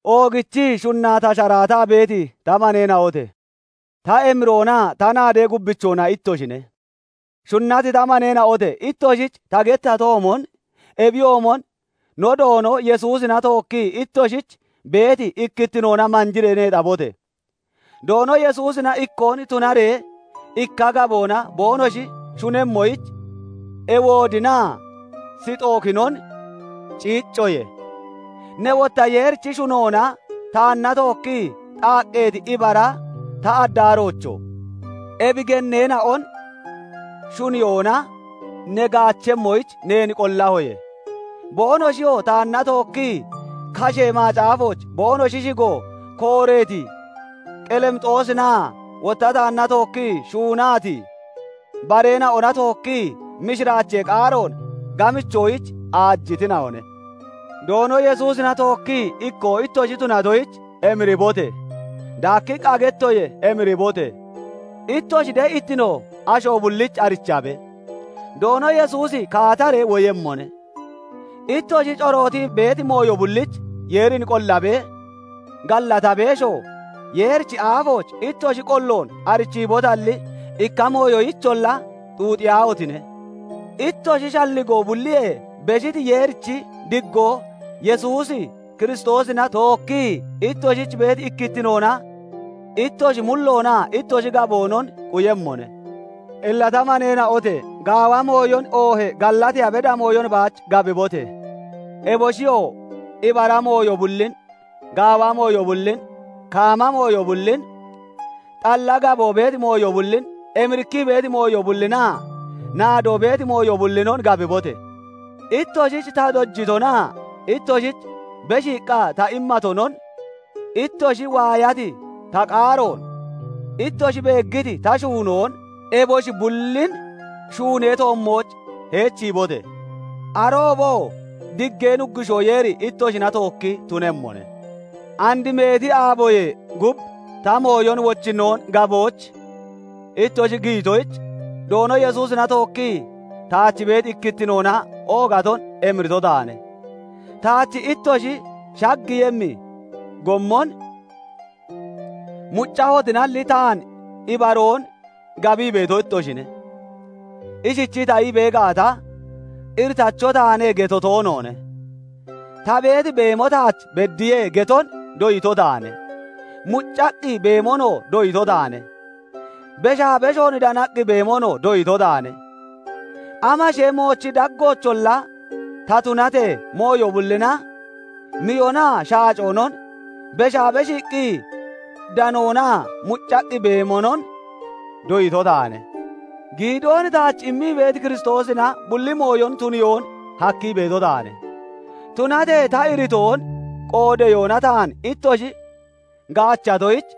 Oogichii shunnaa ta sharaataa beeti ta maneena'ote! Ta emiroonaa ta naadee gubbichoona ittoshine; shunnati ta maneena'ote! Ittoshich ta gettatoomon ebiyoomon no Doono Yesuusina tookkii ittoshich beeti ikkittinoona manjiree neexabote! Doono Yesuusina ikkoon tunaree ikka gaboona boonoshi shunemmoyich Ewoodinaa Sixookinon ciiccoye. Ne wotta Yeerichi shuunoona taanna tookkii xaaqqeeti ibara ta addaaroocho! Ebi genneena'on shuniyoona ne gaachemmoyich neen qollahoye; boonoshiyoo taanna tookkii, kashee macaafooch boonoshi shigo kooreeti Qelimixoosinaa wotta taanna tookkii shuunati bareena'ona tookkii mishiraachee qaaroon gamichoyich aajitina'one. Doono Yesuusina tookkii ikkoo ittoshi tunatoyich emiribote! Daakkiqqa gettoye; emiribote! Ittoshi de'ittino asho bullich arichabe. Doono Yesuusi kaataree woyemmone. Ittoshi corootii beeti mooyo bullich Yeerin qollabee, gallatabeeshoo, Yeerichi aafooch ittoshi qolloon arichiibotalli, ikka mooyoyicholla xuuxiyaahotine! Ittoshi shalligoo bulliyee beshiti Yeerichi diggoo Yesuus Kiristoosina tookkii itooshich beeti ikkittinoona ittoshi mulloonaa ittoshi gaboonon quyemmone. Illa ta maneena'ote! Gaawa mooyon oohee gallateeya beda mooyon baach gabibote! Eboshiyoo ibara mooyo bullin, gaawa mooyo bullin, kaama mooyo bullin, xalla gaboo beeti mooyo bullin, emirikkii beeti mooyo bullinaa naadoo beeti mooyo bullinon gabibote! Ittoshich ta dojitonaa ittoshich beshiiqqa ta immatonon, ittoshi waayati ta qaaroon, ittoshi beeggiti ta shuunoon, eboshi bullin shuunee toommooch heechiibote! Arooboo diggee Nuggushoo Yeeri ittoshina tookki tunemmone. And meeti aaboyee gub ta mooyon wochinnoon gabooch ittoshi giyitoyich, Doono Yesuusina tookkii taach beeti ikkittinoona oogaton emirito taane. Taach ittoshi shaggiiyemmi gommon muccahotinalli taan ibaroon gabii beeto ittoshine. Ishichii ta ii bee gaata, "Iritacho taane" geto toonoone. "Ta beeti beemo taach beddiye" geton doyito taane. Muccaqqi beemonoo doyito taane; beshaa beshoon danaqqi beemonoo doyito taane; amashee moochi daggoocholla ta tunatee, mooyo bullina, miyonaa shaacoonon, beshaa beshiiqqi danoonaa muccaqqi beemonon doyito taane. Giidoon taach immii beeti Kiristoosina bulli mooyon tuniyoon hakkii beeto taane. Tunatee ta iritoon qoodeyoona taan ittoshi gaachatoyich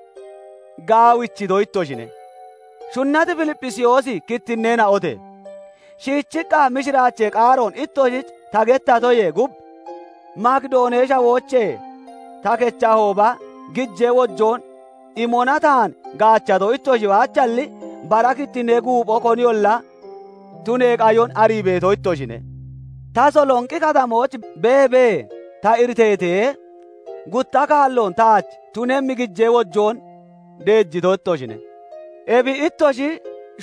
gaawichito ittoshine. Shunnati Filipphisiyoosi kittinneena'ote! Shiichiqqa mishiraachee qaaroon ittoshich ta gettatoyee gub Makidoonee Shawoochee ta kechahooba, gijee wojoon imona taan gaachato ittoshi baachalli, bara kittinnee guupho koniyolla tunee qayon arii beeto ittoshine. Tasalonqi Katamooch beebee ta iriteetee, gutta kaalloon taach tunemmi gijee wojoon deejito ittoshine. Ebi ittoshi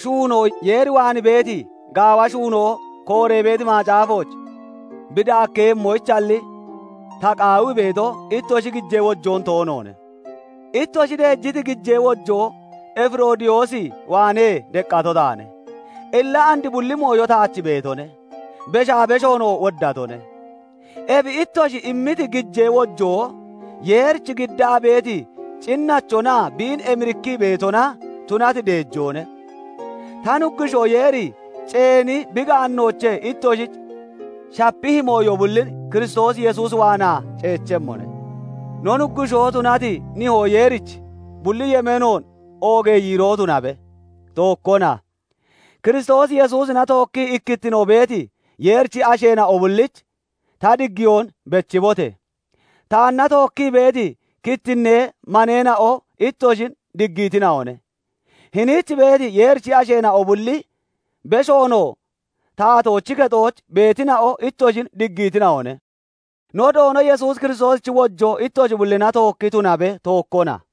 shuunoo Yeer waan beeti, gaawa shuunoo kooree beeti macaafooch bi daakkeeyemmoyichalli ta qaawii beeto, ittoshi gijee wojoon toonoone. Ittoshi deejiti gijee wojoon Efiroodiyoos waanee deqqato taane; illa and bulli mooyo taach beetone; beshaa beshoonoo woddatone. Ebi ittoshi immiti gijee wojoo Yeerich giddaa beeti cinnachonaa biin emirikkii beetona tunati deejoone. Ta Nuggushoo Yeeri ceeni bi gaannoochee ittoshich shapihi mooyo bullin Kiristoos Yesuus waanaa ceechemmone. No Nuggushoo tunati Nihoo Yeerich bulli yemeenoon oogee yiiroo tunabe; tookkona. Kiristoos Yesuusina tookkii ikkittino beeti Yeerichi asheena'o bullich ta diggiyoon bechibote! Taanna tookkii beeti kittinnee maneena'o ittoshin diggiitina'one. Hiniich beeti Yeerichi asheena'o bulli, beshoonoo taatoochi kexooch beetina'o ittoshin diggiitina'one. No Doono Yesuus Kiristoosichi wojoo ittoshi bullina tookki tunabe[; tookkona].